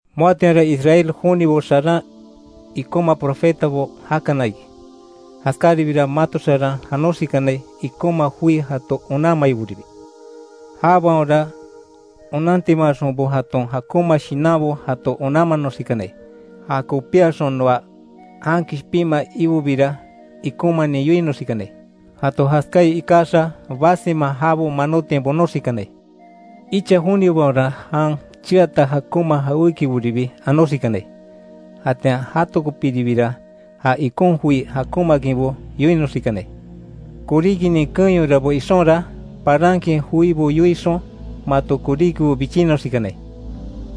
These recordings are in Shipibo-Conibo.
Moatianra Israel jonibo xaran ikonma profetabo jakana iki, jaskáribiira mato xaran janoxikanai ikonma joi jato onanmaiboribi. Jabaonra onantimaaxonbo jaton jakonma shinanbo jato onanmanoxikanai; ja kopíaxon noa jan kishpinmaa Ibobira ikonmanin yoinoxikanai. Jato jaskáai ikaxa basima jabo manotiain bonoxikanai. Icha jonibaonra jan cheata jakonma jawékiboribi anoxikanai; jatian jatokopiribira ja ikon joi jakonmaakinbo yoinoxikanai. Koríkinin keenyorabo ixonra, parankin joibo yoixon mato koríkibo bichinnoxikanai.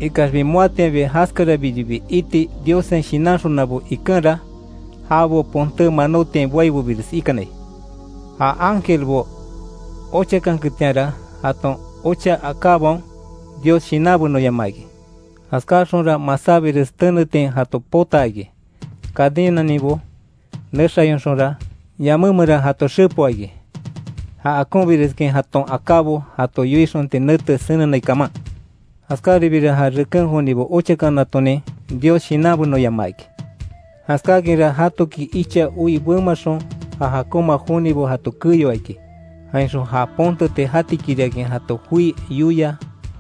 Ikaxbi moatianbi jaskarabiribi iti Diossen shinanxonabo ikenra, jabo ponté manótiain boaibobires ikanai. Ja ángelbo ochakanketianra jaton ocha akábaon Dios shinanbenoyamaa iki; jaskáxonra masábires tenetiain jato potaa iki, cadenaninbo nexayonxonra, yamé meran jato xepoa iki, ja akonbireskin jaton akábo jato yoixonti nete senenai kaman. Jaskáribiira ja reken jonibo ochakanatonin Dios shinanbenoyamaa iki; jaskákinra jatoki icha oi bemaxon ja jakonma jonibo jato keyoa iki, jainxon ja ponteti jatikiriakin jato joi yoia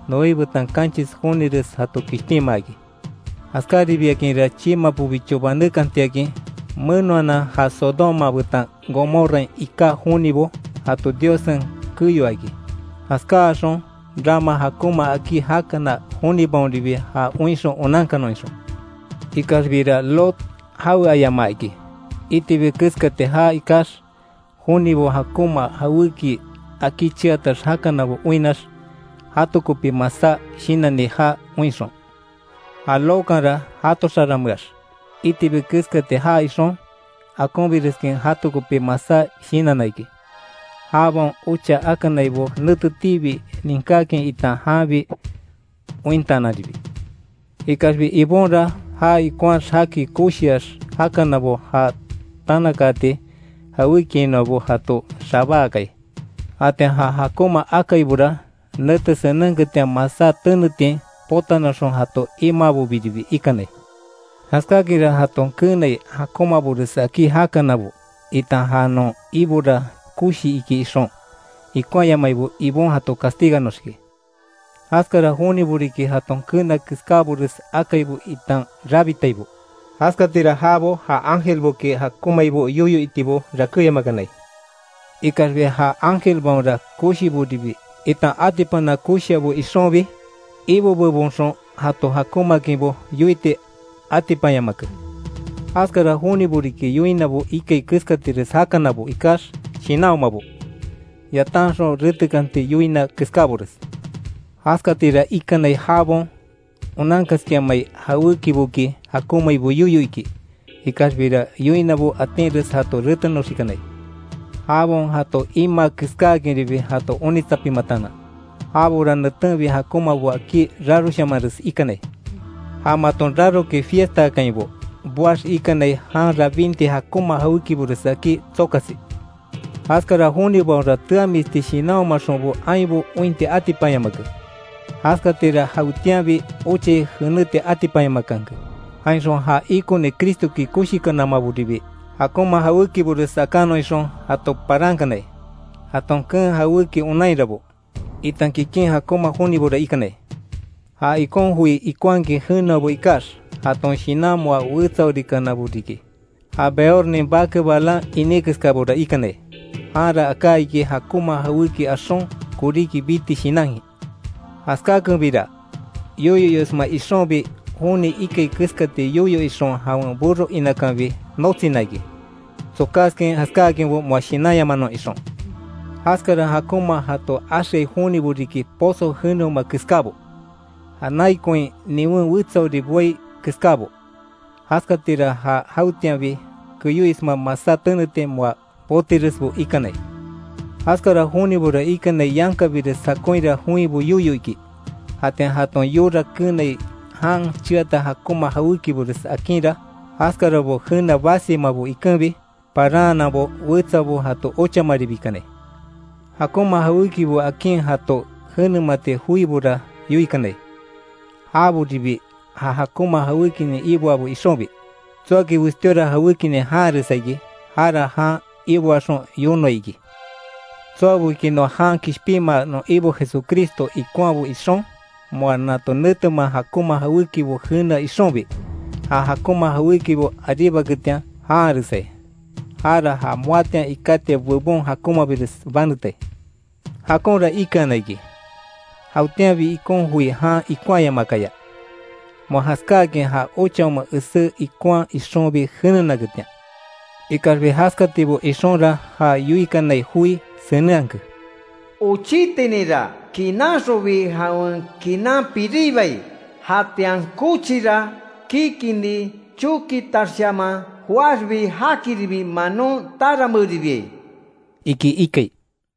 Noé betan kanchis jonires jato kishpinmaa iki. Jaskáribiakinra, chiimapobicho banekantiakin menoanan ja Sodoma betan Gomorrain iká jonibo jato Diossen keyoa iki, jaskáxon rama jakonma akí jakana jonibaonribi ja oinxon onankanon ixon. Ikaxbira Lot jaweayamaa iki, itibi keskati jaa ikax; jonibo jakonma jawéki akí cheatax jakanabo oinnax, jato kopi masá shinanni jaa oinxon. Ja Lotkanra jato xarameax itibi keskati jaa ixon, akonbireskin jato kopi masá shinanna iki; jabaon ocha akanaibo netetiibi ninkákin itan janbi ointaananribi. Ikaxbi Ibonra ja ikonhaax jaki koshiax jakanabo ja tanakaati jawékiainoabo jato xabáakai. Jatian ja jakonma akaibora, nete senenketian masá tenetiain potanoxon jato imaabobiribi ikanai. Jaskáakinra jaton keenai jakonmabores akí jakanabo, itan ja non Ibora koshii iki ixon, ikonhayamaibo Ibon jato castiganoxiki. Jaskara jonibo riki jaton keena keskábores akaibo itan rabitaibo, jaskatira jabo ja ángelboki jakonmaibo yoyo itibo rakéyamakanai. Ikaxbi ja ángelbaonra koshiboribi itan atipana koshiabo ixonbi, Ibo bebonxon jato jakonmaakinbo yoiti atipanyamake. Jaskara jonibo riki yoinabo ikai keskatires jakanabo ikax shinanhomabo, yatanxon retekanti yoina keskábores. Jaskatira ikanai jabaon onankaskinhamai jawékiboki jakonmaibo yoyo iki, ikaxbira yoinabo atinres jato retenoxikanai, jabaon jato imaa keskáakinribi jato onitsapimataanan. Jabora netenbi jakonmabo akí raroshamanres ikanai. Ja maton rarokin fiestaakainbo boax ikanai jan rabinti jakonma jawékibores akí tsokasi. Jaskara jonibaonra teamisti shinanhomaxonbo ainbo ointi atipanyamake, jaskatira jawetianbi ochai jeneti atipanyamakanke; jainxon ja ikoni Cristoki koshikanamaboribi jakonma jawékibores akanon ixon jato parankanai; jaton keen jawéki onainrabo, itan kikin jakonma jonibora ikanai. Ja ikon joi ikonhakin jeneabo ikax, jaton shinan moa wetsaorikanabo riki ja Beornin bake Balaam iní keskábora ikanai, janra aká iki jakonma jawéki axon koríki biti shinankin. Jaskákenbira, yoyo iosma ixonbi joni ikai keskati yoyo ixon jawen burro inakanbi notsina iki, tsokáskin jaskáakinbo moa shinanyamanon ixon. Jaskara jakonma jato axeaai jonibo riki pozo jeneoma keskábo; ja nai koin niwen wetsaori boai keskábo. Jaskatira ja jawetianbi keyoisma masá tenetiain moa botiresbo ikanai. Jaskara jonibora ikanai yankabires jakonhira joinbo yoyo iki. Jatian jaton yora keenai jan cheata jakonma jawékibores akinra, jaskarabo jenea basimabo ikenbi, paranhananbo wetsabo jato ochamaribakanai. Jakonma jawékibo akin jato jenemati joibora yoikanai, jaboribi ja jakonma jawékinin iboabo ixonbi. Tsoaki westíora jawékinin janharesai iki, jara jan iboaxon yonoai iki. Tsoaboki noa jan kishpinmaa non Ibo Jesucristo ikonhabo ixon, moa nato netemea jakonma jawékibo jenea ixonbi, ja jakonma jawékibo aríbaketian janharesai, jara ja moatian ikátiai bebon jakonmabires banetai. Jakonra ikeana iki, jawetianbi ikon joi jan ikonhayamaakaya; moa jaskáakin ja ochaoma esé ikonhaa ixonbi jenenaketian. Ikaxbi jaskatibo ixonra ja yoikanai joi senenhake: “Ochítininra kinanxonbi jawen kinan piribai”, “jatian kochira kikini chokitaxshaman joaxbi, jakiribi manon taranmeeribiai”, iki ikai.